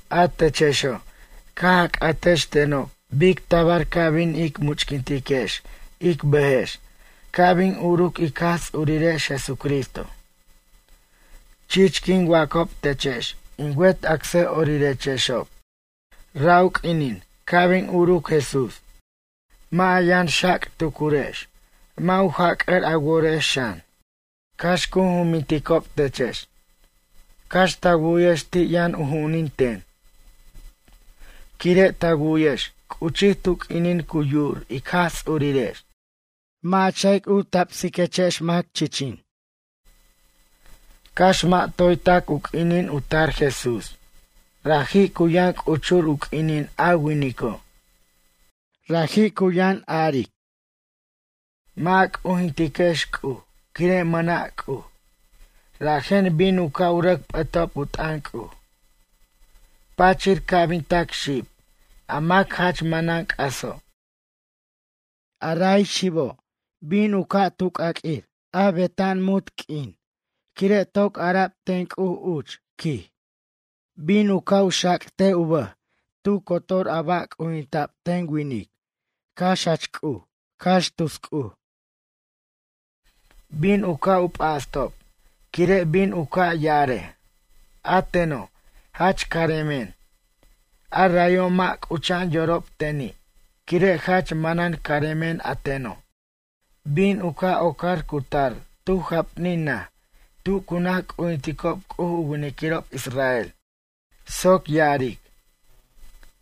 A techexo' caj a c'atex tenob bic tabar ca' bin ic much'quintiquex ic bʌjex ca' bin uruc ic Jaj Ts'urirex Jesucristo. Chich quin wacob techex in wet acsʌ'orirechexob. Ra' u q'uinin ca' bin uruc Jesús. Mʌ' a yʌn xac' tucurex mʌ' u jac'ʌr a worex xan. Cax cu jumbinticob techex. Cax ta wu'yex ti' yʌn u ju'unin ten. Quire' ta wu'yex c'uchij tu q'uinin cu yu'ur ic Jaj Ts'urirex. Mʌ' a ch'a'ic u tabsiquex mac chichin. Cax mʌ' toy tac u q'uinin u tar Jesús raji' cu yʌn c'uchur u q'uinin a winico'. Raji' cu yʌn ya'arej: Mʌ' a c'ujintiquex C'uj quire' mʌna' C'uj. Rajen bin u ca' rʌc p'ʌtob u t'ʌn C'uj. Pachir ca' bin tac xib a mac jach manan c'aso'. Ara xibo' bin u ca' tu c'aq'uir beta'an munt q'uin quire' toc ara'b ten C'uj uch, quij. Bin u ca' xac' tu bʌj tu cotor a ba' c'ujinta'b ten winic cax jach C'uj, cax tus c'uj. Bin u ca' u p'astob quire' bin u ca' ya'arej: A teno', jach caremen, arayo' mʌ' c'ucha'an yorob teni' quire' jach manan caremen ateno'. Bin u ca' ocar cutar tu japnin naj tu cu naj c'ujinticob C'uj u winiquirob israel soc ya'aric: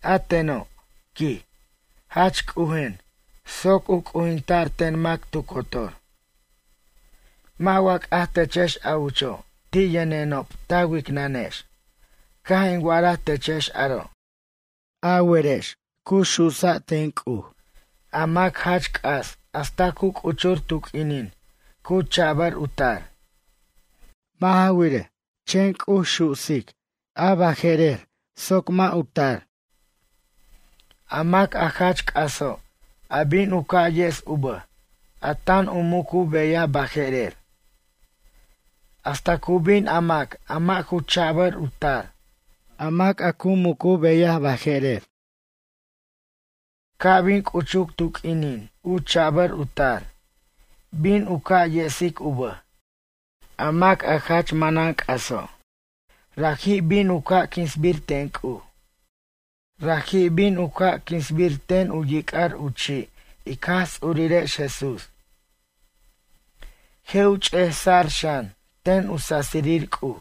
A teno', quij, jach c'ujen' soc u c'ujinta'r ten mac tu cotor. Mʌ' wa c'aj techex a ucho' ti' yʌnenob ta wicnʌnex caj in wa'araj techex aro'? A werex cu su'sa' ten C'uj a mac jach c'as hasta cu c'uchur tu q'uinin cu cha'bʌr u tar. Mʌ' ja wirej, chen C'uj su'sic a baje'rer soc mʌ' u tar. A mac a jach c'aso', a bin u ca' yes u bʌj, a tan u muc u beyaj baje'erer. Hasta cu bin a mac a mʌ' ju cha'bʌr u tar, a mac a cu muc u beyaj baje'rer. Ca' bin c'uchuc tu q'uinin u cha'bʌr u tar, bin u ca' yesic u bʌj, a mac a jach manan c'aso'. Raji' bin u ca' quinsbir ten C'uj. Raji' bin u ca' quinsbir ten u yic'ar u chi' ic Jaj Ts'urirex Jesús. Je' ch'ejsa'r xan ten u sasirir C'uj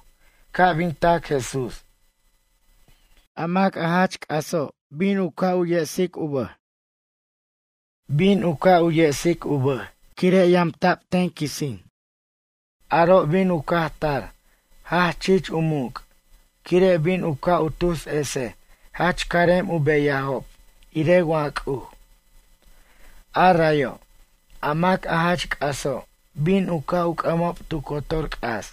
ca' bin tac Jesús. A mac a jach c'aso' bin u ca' yesic u bʌj. Bin u ca' yesic u bʌj quire' yamta' ten quisin. Aro' bin u caj tar jach chich u muc', quire' bin u ca' u tus esej jach carem u beyajob irej wa C'uj. A rayo', a mac a jach c'aso' bin u ca' u c'ʌmob tu cotor c'as,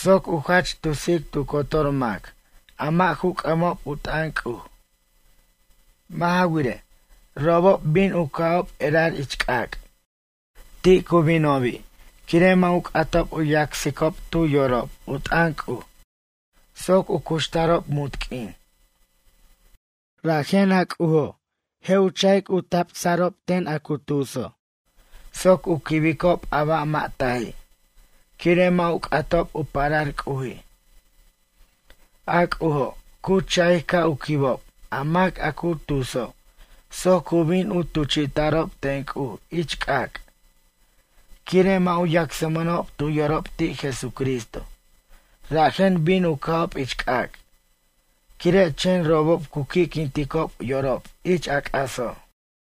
soc u jach tusic tu cotor mac a mʌ' ju c'ʌmob u t'ʌn C'uj. Mʌ' ja wirej, robob bin u ca'ob erar ich c'ac'. Ti' cu binobi' quire' mʌ' u c'atob u yacsicob tu yorob u t'ʌn C'uj soc u cuxtarob munt q'uin. Rajen a C'ujo', je' u cha'ic u tabsa'rob ten a cu tuso' soc u quibicob a ba' mʌ' taji', quire' mʌ' u c'atob u parar C'uji'. A C'ujo' cu cha'ic ca' u quibob a mac a cu tuso' soc u bin tuchi'ta'rob ten C'uj ich c'ac'. Quire' mʌ' u yacsmʌnob tu yorob ti' Jesucristo rajen bin u ca'ob ich c'ac' quire' chen robob cu qui'quinticob yorob ich a c'aso'.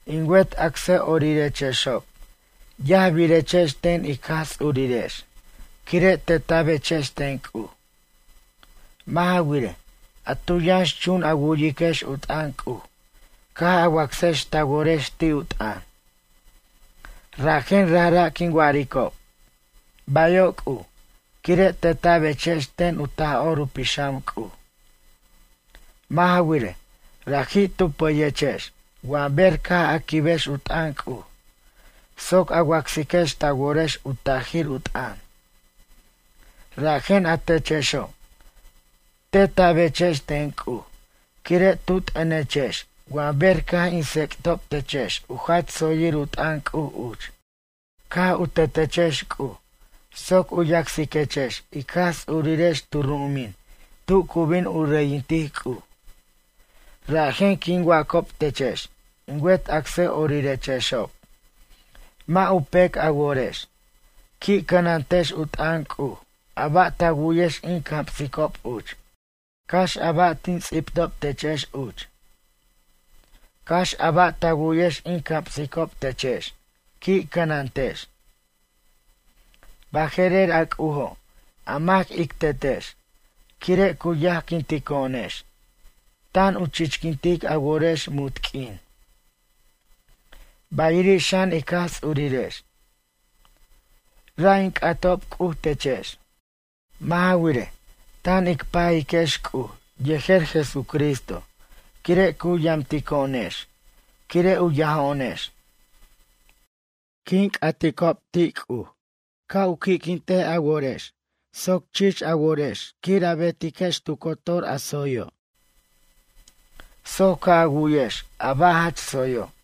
In wet acsʌ'orirechexob yajbirechex ten ic Jaj Ts'urirex quire' teta'bechex ten C'uj. Mʌ' ja wirej, a tu yʌnx chun a wu'yiquex u t'ʌn C'uj caj a wacsex ta worex ti' u t'ʌn. Rajen rajra' quin wa'aricob: “Bayo' C'uj” quire' teta'bechex ten u Taj'or u Pixam C'uj. Mʌ' ja wirej, raji' tu pʌyechex wa ber caj a quibex u t'ʌn C'uj soc a wacsiquex ta worex u tajir u t'ʌn. Rajen a techexo', teta'bechex ten C'uj quire' tu t'ʌnechex wa ber caj in tsec'tob techex u jach tsoyir u t'ʌn C'uj uch. Caj u tetechex C'uj soc u yacsiquechex ic Jaj Ts'urirex tu ru'umin tu cu bin u reyintic C'uj. Rajen quin wacob techex in wet acsʌ'orirechexob, mʌ' u pec a worex. Qui' cʌnantex u t'ʌn C'uj a ba' ta wu'yex in camsicob uch. Cax a ba' tin ts'ibtob techex uch. Cax a ba' ta wu'yex in camsicob techex, qui' cʌnantex. Baje'rer a C'ujo', a mac ic Tetex, quire' cu yajquintico'onex, tan u chichquintic a worex munt q'uin. Bayiri' xan ic Jaj Ts'urirex. Ra' in c'atob C'uj techex. Mʌ' ja wirej, tan ic pajiquex C'uj yejer Jesucristo quire' cu yamtico'onex quire' u yajo'onex. Quin c'atob ti' C'uj ca' u qui'quintej a worex soc chich a worex quir a betex tu cotor a tsoyo'. Soc ca' a wu'yex a ba' jach tsoyo'.